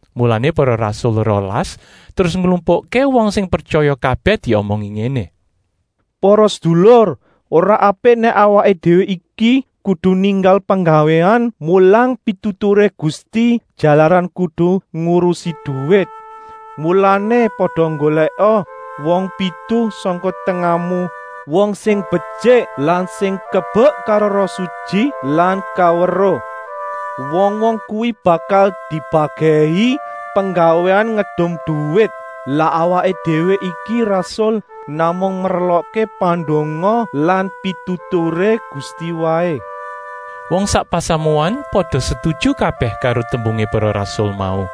Mulané para rasul rolas terus nglumpukké wong sing pretyaya kabèh diomongi ngéné: “Para sedulur, ora apik nèk awaké déwé iki kudu ninggal penggawéan mulang pituturé Gusti, jalaran kudu ngurusi duwit. Mulané, pada nggolèka wong pitu sangka tengahmu, wong sing betyik lan sing kebek karo Roh Sutyi lan kaweruh. Wong-wong kuwi bakal dibagèhi penggawéan ngedum duwit. Lah awaké déwé iki rasul namung merlokké pandonga lan pituturé Gusti waé.” Wong sak pasamuan pada setuju kabèh karo tembungé para rasul mau,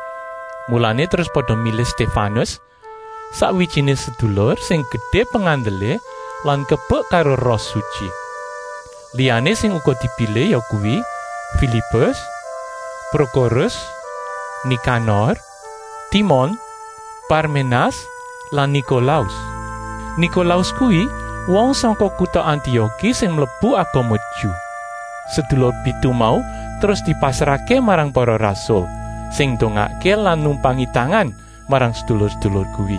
mulané terus pada milih Stéfanus, sakwijiné sedulur sing gedé pengandelé lan kebek karo Roh Sutyi. Liyané sing uga dipilih yakuwi: Filipus, Prokorus, Nikanor, Timon, Parménas lan Nikolaus. Nikolaus kuwi wong sangka kuta Antioki sing mlebu agama Ju. Sedulur pitu mau terus dipasrahké marang para rasul, sing ndongakké lan numpangi tangan marang sedulur-sedulur kuwi.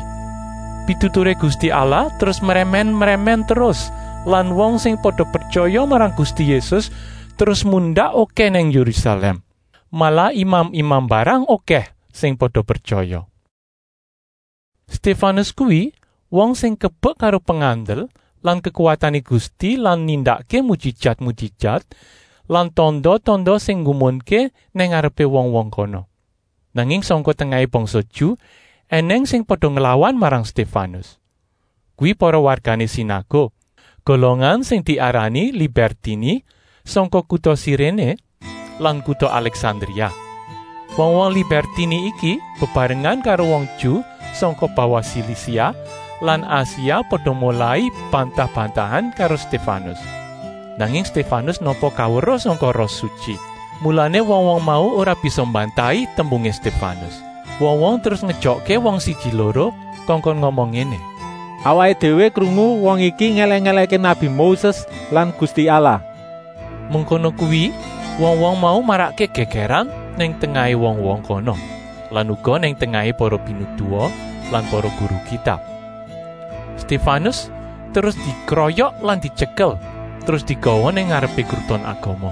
Pituturé Gusti Allah terus mrèmèn-mrèmèn terus lan wong sing pada pretyaya marang Gusti Yésus terus mundak okèh nang Yérusalèm, malah imam-imam mbarang okèh sing pada pretyaya. Stéfanus kuwi wong sing kebek karo pengandel lan kekuwatané Gusti lan nindakké mujijat-mujijat lan tanda-tanda sing nggumunké nang ngarepé wong-wong kono. Nanging sangka tengahé bangsa Ju ènèng sing pada nglawan marang Stéfanus. Kuwi para wargané sinaguk, golongan sing diarani Libèrtini, sangka kuta Siréné lan kuta Alèksandria. Wong-wong Libèrtini iki bebarengan karo wong Ju sangka bawah Silisia lan Asia pada molai bantah-bantahan karo Stéfanus. Nanging Stéfanus nampa kaweruh sangka Roh Sutyi, mulané wong-wong mau ora bisa mbantahi tembungé Stéfanus. Wong-wong terus ngejokké wong siji-loro kongkon ngomong ngéné: “Awaké déwé krungu wong iki ngèlèk-èlèkké nabi Moses lan Gusti Allah!” Mengkono kuwi wong-wong mau marakké gègèran nang tengahé wong-wong kono lan uga nang tengahé para pinituwa lan para guru Kitab. Stéfanus terus dikroyok lan dityekel, terus digawa nang ngarepé Kruton Agama.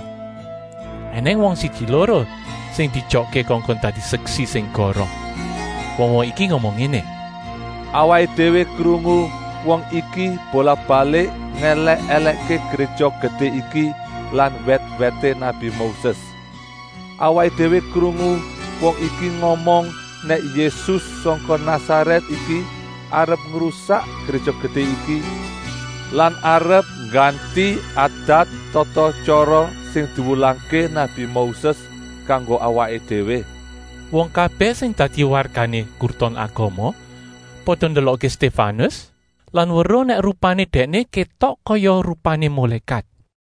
Enèng wong siji-loro sing dijokké kongkon dadi seksi sing goroh. Wong-wong iki ngomong ngéné: “Awaké déwé krungu wong iki bolak-balik ngèlèk-èlèkké Gréja Gedé iki lan wèt-wèté nabi Moses. Awaké déwé krungu wong iki ngomong nèk Yésus sangka Nasarèt iki arep mbubrah Gréja Gedé iki lan arep ngganti adat-tata-tyara sing diwulangké nabi Moses kanggo awaké déwé.” Wong kabèh sing dadi wargané Kruton Agama pada ndelokké Stéfanus lan weruh nèk rupané dèkné kétok kaya rupané mulékat.